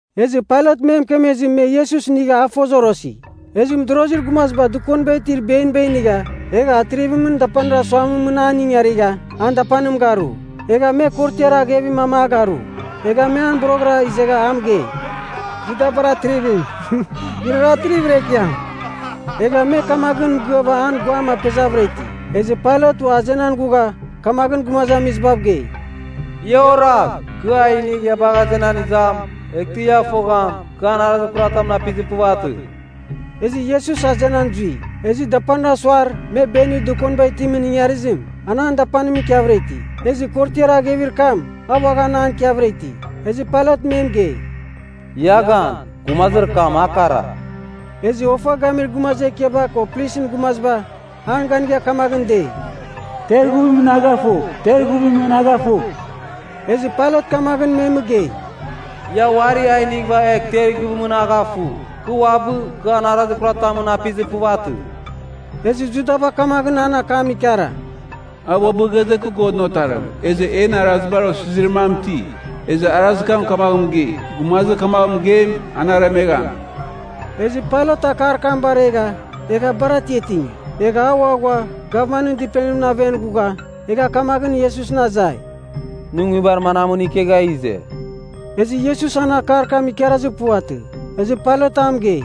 Ezɨ Pailat me mɨkemezɨ me Iesus inigha a ifozorosi. Ezɨ mɨdorozir gumaziba dɨkoniba itir beniba inigha egha atrivimɨn dapanir asuamɨn mɨn an ingarigha, an dapanim garu. Egha me korotiar aghevir mam a garu. Egha me an boroghɨra izegha a mɨgei, “Judabar Atrivim, nɨrara atrivir ekiam!” Egha me kamaghɨn mɨgɨava an guam apezavɨra iti. Ezɨ Pailat ua azenan ghugha kamaghɨn gumazamizibav gei, “Ia oragh. Kɨ a inigh ia bagh azenan izam, eghtɨ ia fogham, kɨ an arazir kuratamɨn apizir puvatɨ.” Ezɨ Iesus azenan zui. Ezɨ dapanir asuar me benir dɨkoniba itimɨn ingarizim, an an dapanimɨn ikiavɨra iti. Ezɨ korotiar aghevir kam, a uaghan an ikiavɨra iti. Ezɨ Pailat me mɨgei, “Ia gan, gumazir kam a kara.” Ezɨ ofa gamir gumazir ekiaba ko plisɨn gumaziba an ganigha kamaghɨn dei, “Ter ighuvimɨn a gafugh! Ter ighuvimɨn a gafugh!” Ezɨ Pailat kamaghɨn me mɨgei, “Ia uari a inighɨva egh ter ighuvimɨn a gafugh. Kɨ uabɨ, kɨ an arazir kuratamɨn apizir puvatɨ.” Ezɨ Judaba kamaghɨn an akam ikara, “A uabɨ ghaze ‘Kɨ Godɨn Otarim.’ Ezɨ en Arazibar Osizirir mam iti, ezɨ arazir kam kamaghɨn mɨgei, gumazir kamagh mɨgeim, an aremegham.” Ezɨ Pailat akar kam baregha egha bar atiatingi. Egha a ua ghua gavmanɨn dɨpenimɨn aven ghugha, egha kamaghɨn Iesusɨn azai, “Nɨ nguibar manamɨn ikegha ize?” Ezɨ Iesus an akar kam ikarazir puvatɨ. Ezɨ Pailat a mɨgei,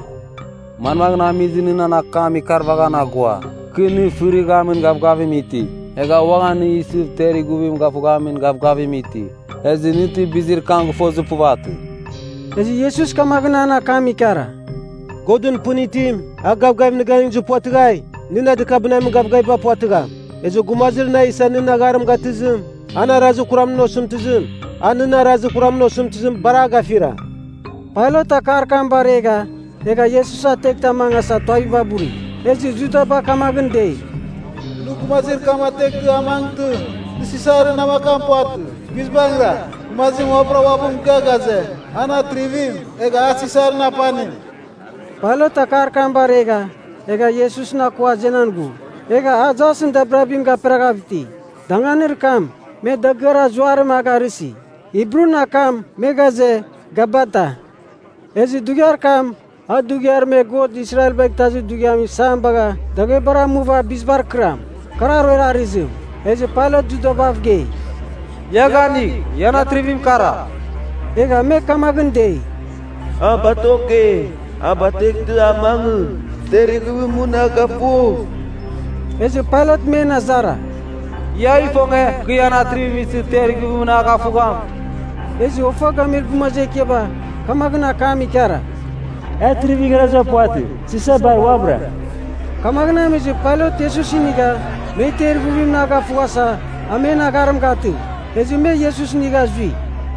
“Manmaghɨn amizɨ nɨ nan akam ikarvaghan aghua? Kɨ nɨ fɨrighamin gavgavim iti, egha uaghan nɨ isɨv temer ighuvim gafughamin gavgavim iti. Ezɨ nɨ ti bizir kam gɨfozir puvatɨ?” Ezɨ Iesus kamaghɨn an akam ikara, “Godɨn pɨn itim, a gavgavim nɨ ganɨngizir puvatɨghai, nɨ na dɨkabɨnamin gavgaviba puvatɨgham. Ezɨ gumazir na isa nɨn agharim gatɨzim, an arazir kuramɨn osɨmtɨzim, a nɨn arazir kuramɨn osɨmtɨzim, bar a gafira.” Pailat akar kam baregha egha Iesus ateghtɨ a mangasa tuaviba buri. Ezɨ Judaba kamaghɨn dei, “Nɨ gumazir kam ateghtɨ a mangɨtɨ, nɨ Sisarɨn namakam puvatɨ. Guizbangɨra, gumazim uabɨra uabɨ mɨgɨa ghaze, an atrivim, egha a Sisarɨn apanim.” Pailat akar kam baregha, egha Iesusɨn akua azenan ghu. Egha a jasɨn dabirabim gaperaghav iti, danganir kam me “Dagɨar Azuarim” a garɨsi. (Hibrun akam me ghaze, “Gabata”). Ezɨ dughiar kam a dughiar me God Israelbagh Itazir Dughiamɨn isam bagha daghebar amuva bizibar kɨram. Kar aruer arɨzim. Ezɨ Pailat Judabav gei, “Ia ganigh! Ian Atrivim kara.” Egha me kamaghɨn dei, “A batokegh! A batueghtɨ a mangɨ! Ter ighuvimɨn a gafugh!” Ezɨ Pailat men azara, “Ia ifonge, kɨ ian Atrivim isɨ ter ighuvimɨn a gafugham?” Ezɨ ofa gamir gumazir ekiaba kamaghɨn akam ikara, “E atrivir igharaziba puvatɨ. Sisar bar uabɨra!” Kamaghɨn amizɨ Pailat Iesus inigha, me ter ighuvimɨn a gafughasa, a men agharim gatɨ. Ezɨ me Iesus inigha zui.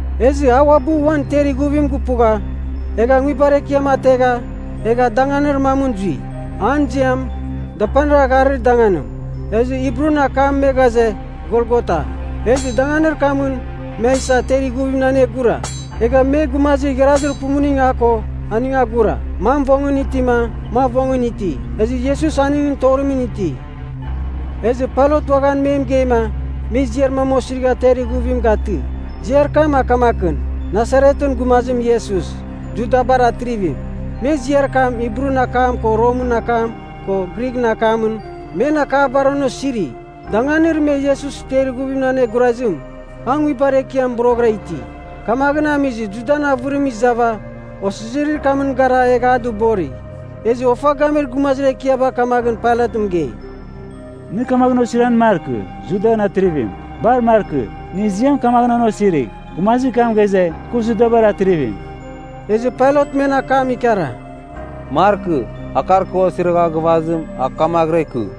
Ezɨ a uabɨ uan ter ighuvim gupugha, egha nguibar ekiam ategha egha danganir mamɨn zui, an ziam “Dapanir Agharir Danganim.” (Ezɨ Hibrun akam me ghaze “Golgota.”) Ezɨ danganir kamɨn me a isa ter ighuvimɨn anegura. Egha me gumazir igharazir pumuning a ko, aning agura, mam vongɨn itima, mam vongɨn iti. Ezɨ Iesus aningɨn torimɨn iti. Ezɨ Pailat uaghan me mɨgeima me ziar mam osirigha ter ighuvim gatɨ. Ziar kam a kamakɨn, “Nasaretɨn Gumazim Iesus, Judabar Atrivim.” Me ziar kam, Hibrun akam ko Romɨn akam ko Grighɨn akamɨn, men akabar an osiri. Danganir me Iesus ter ighuvimɨn anegurazim, a nguibar ekiam boroghɨra iti, kamaghɨn amizɨ Judan avɨrim izava osizirir kamɨn gara egha a dɨbori. Ezɨ ofa gamir gumazir ekiaba kamaghɨn Pailat mɨgei, “Nɨ kamaghɨn osiran markɨ, ‘Judan Atrivim.’ Bar markɨ. Nɨ ziam kamaghɨn an osirigh, ‘Gumazir kam ghaze, kɨ Judabar Atrivim.’” Ezɨ Pailat men akam ikara, “Markɨ. Akar kɨ osirigha gɨvazim, a kamaghɨra ikɨ.”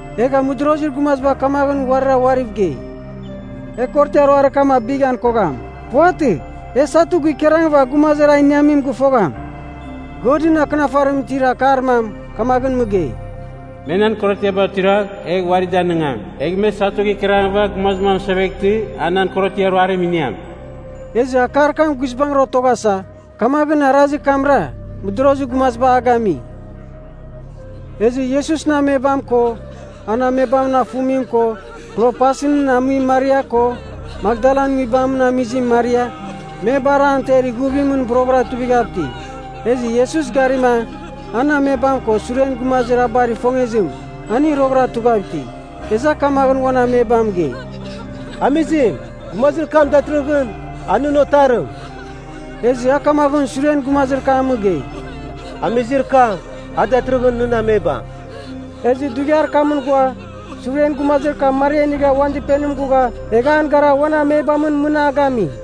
Egha mɨdorozir gumaziba kamaghɨn uarira uariv gei, “E korotiar ruarir kam abighan kogham. Puvatɨ. E satu gikararangɨva gumazir a iniamim gɨfogham.” Godɨn Akɨnafarimɨn itir akar mam kamaghɨn mɨgei, “Me nan korotiaba tuiragh, egh uari danɨngam. Egh me satu gikararangɨva gumazim amɨseveghtɨ a nan korotiar ruarim iniam.” Ezɨ akar kam guizbangɨra otoghasa, kamaghɨn arazir kamra mɨdorozir gumaziba a gami. Ezɨ Iesusɨn amebam ko, an amebamɨn afumim ko, Klopasɨn amuim Maria ko, Makdalan nguibamɨn amizim Maria, me bar an ter ighuvimɨn boroghɨra tuivighav iti Ezɨ Iesus garima an amebam ko suren gumazir a bar ifongezim, aning roghɨra tughav iti. Ezɨ a kamaghɨn uan amebam mɨgei, “Amizim, gumazir kam datɨrɨghɨn, a nɨn otarim.” Ezɨ a kamaghɨn suren gumazir kam mɨgei, “Amizir kam, a datɨrɨghɨn nɨn amebam.” Ezɨ dughiar kamɨn ghua, suren gumazir kam Maria inigha uan dɨpenimɨn ghugha egha an gara uan amebamɨn mɨn a gami.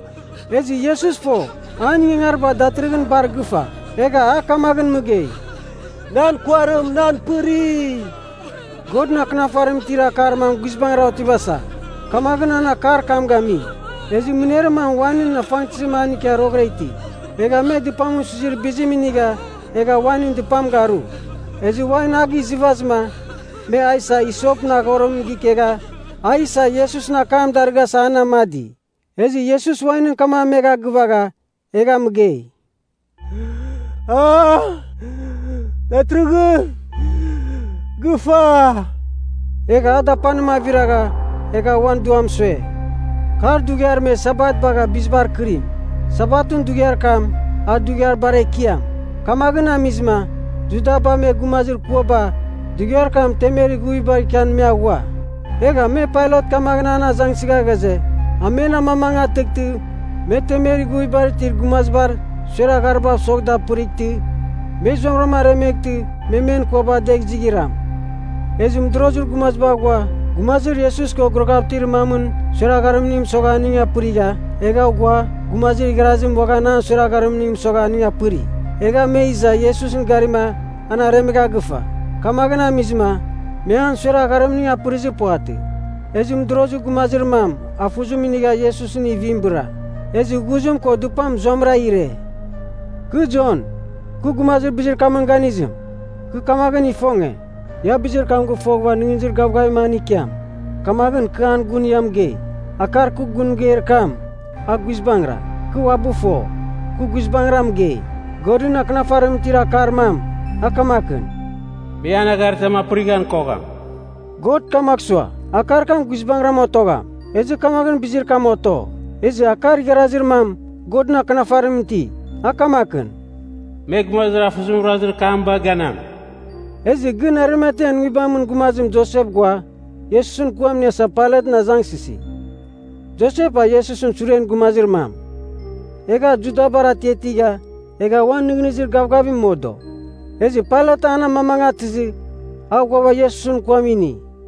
Ezɨ Iesus fo, an ingangariba datɨrɨghɨn bar gɨfa. Egha a kamaghɨn mɨgei, “Nan kuarim nan pɨri.” Godɨn Akɨnafarimɨn itir akar mam guizbangɨra otivasa, kamaghɨn an akar kam gami. Ezɨ mɨner mam wainɨn afangtɨzim an ikia roghɨra iti. Egha me dɨpamɨn suizir bizim inigha egha wainɨn dɨpam garu. Ezɨ wain a gizɨvazɨma, me a isa hisopɨn aghorim gikegha a isa Iesusɨn akam darɨghasa an amadi. Ezɨ Iesus wainɨn kam amegha gɨvagha, egha mɨgei, “A datɨrɨghɨn gɨfa.” Egha a dapanim aviragha egha uan duam sue. Kar dughiar me Sabat bagha bizibar akɨrim. Sabatɨn dughiar kam, a dughiar bar ekiam. Kamaghɨn amizɨma Judaba me gumazir kuaba dughiar kam temer ighuvibar ikian me aghua. Egha me Pailat kamaghɨn an azangsɨgha ghaze, a men amamangatɨghtɨ me temer ighuvibar itir gumazibar suer agharibav sogh da apɨrightɨ, me zuamɨram aremeghtɨ me men kuaba adegh izighram. Ezɨ mɨdorozir gumaziba ghua gumazir Iesus ko guraghav itir mamɨn suer agharimning mɨsogha aning apɨrigha, egha ghua gumazir igharazim uaghan an suer agharimning mɨsogha aning apɨri. Egha me iza Iesusɨn garima an aremegha gɨfa. Kamaghɨn amizɨma me an suer agharimning apɨrizir puvatɨ. Ezɨ mɨdorozir gumazir mam afuzim inigha Iesusɨn ivim bɨra. Ezɨ ghuzim ko dɨpam zuamɨra ire. (Kɨ, Jon, kɨ gumazir bizir kamɨn ganizim, kɨ kamaghɨn ifonge, ia bizir kam gɨfoghɨva nɨghnɨzir gavgavim an ikiam. Kamaghɨn kɨ an gun ia mɨgei. Akar kɨ gun mɨgeir kam, a guizbangɨra. Kɨ uabɨ fo, kɨ guizbangɨra mɨgei.) Godɨn Akɨnafarimɨn itir akar mam, a kamakɨn, “Me an agharitam apɨrighan kogham.” God kamagh sua, akar kam guizbangɨram otogham, ezɨ kamaghɨn bizir kam oto. Ezɨ akar igharazir mam Godɨn Akɨnafarimɨn iti, a kamakɨn, “Me, gumazir afuzimɨn ruazir kam bagh ganam.” Ezɨ gɨn Arimatean nguibamɨn gumazim Josep ghua Iesusɨn kuam iniasa Pailatɨn azangsɨsi. Josep a Iesusɨn suren gumazir mam, egha a Judabar atiatigha, egha uan nɨghnɨzir gavgavim modo. Ezɨ Pailat an amamangatɨzɨ, a ghuava Iesusɨn kuam ini.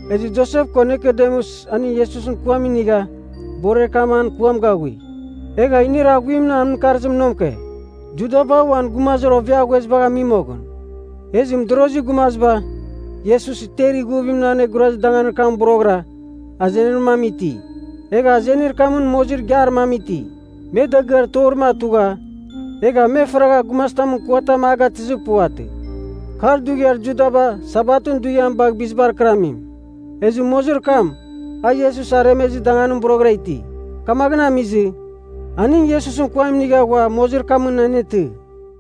Ezɨ Josep ko Nikodemus aning Iesusɨn kuam inigha borer kam an kuam gaghui. Egha inir aghuimɨn an mɨkarzim nomke, Judaba uan gumazir oveaghuezibagh ami moghɨn. Ezɨ mɨdorozir gumaziba Iesus ter ighuvimɨn anegurazir danganir kamɨn boroghɨra, azenir mam iti. Egha azenir kamɨn mozir igiar mam iti, me dagɨar torim atugha, egha me faragha gumazitamɨn kuatam a gatɨzir puvatɨ. Kar dughiar Judaba Sabatɨn dughiam bagh bizibar kɨramim, ezɨ mozir kam, a Iesus aremezir danganim boroghɨra iti. Kamaghɨn amizɨ, aning Iesusɨn kuam inigha ghua mozir kamɨn anetɨ.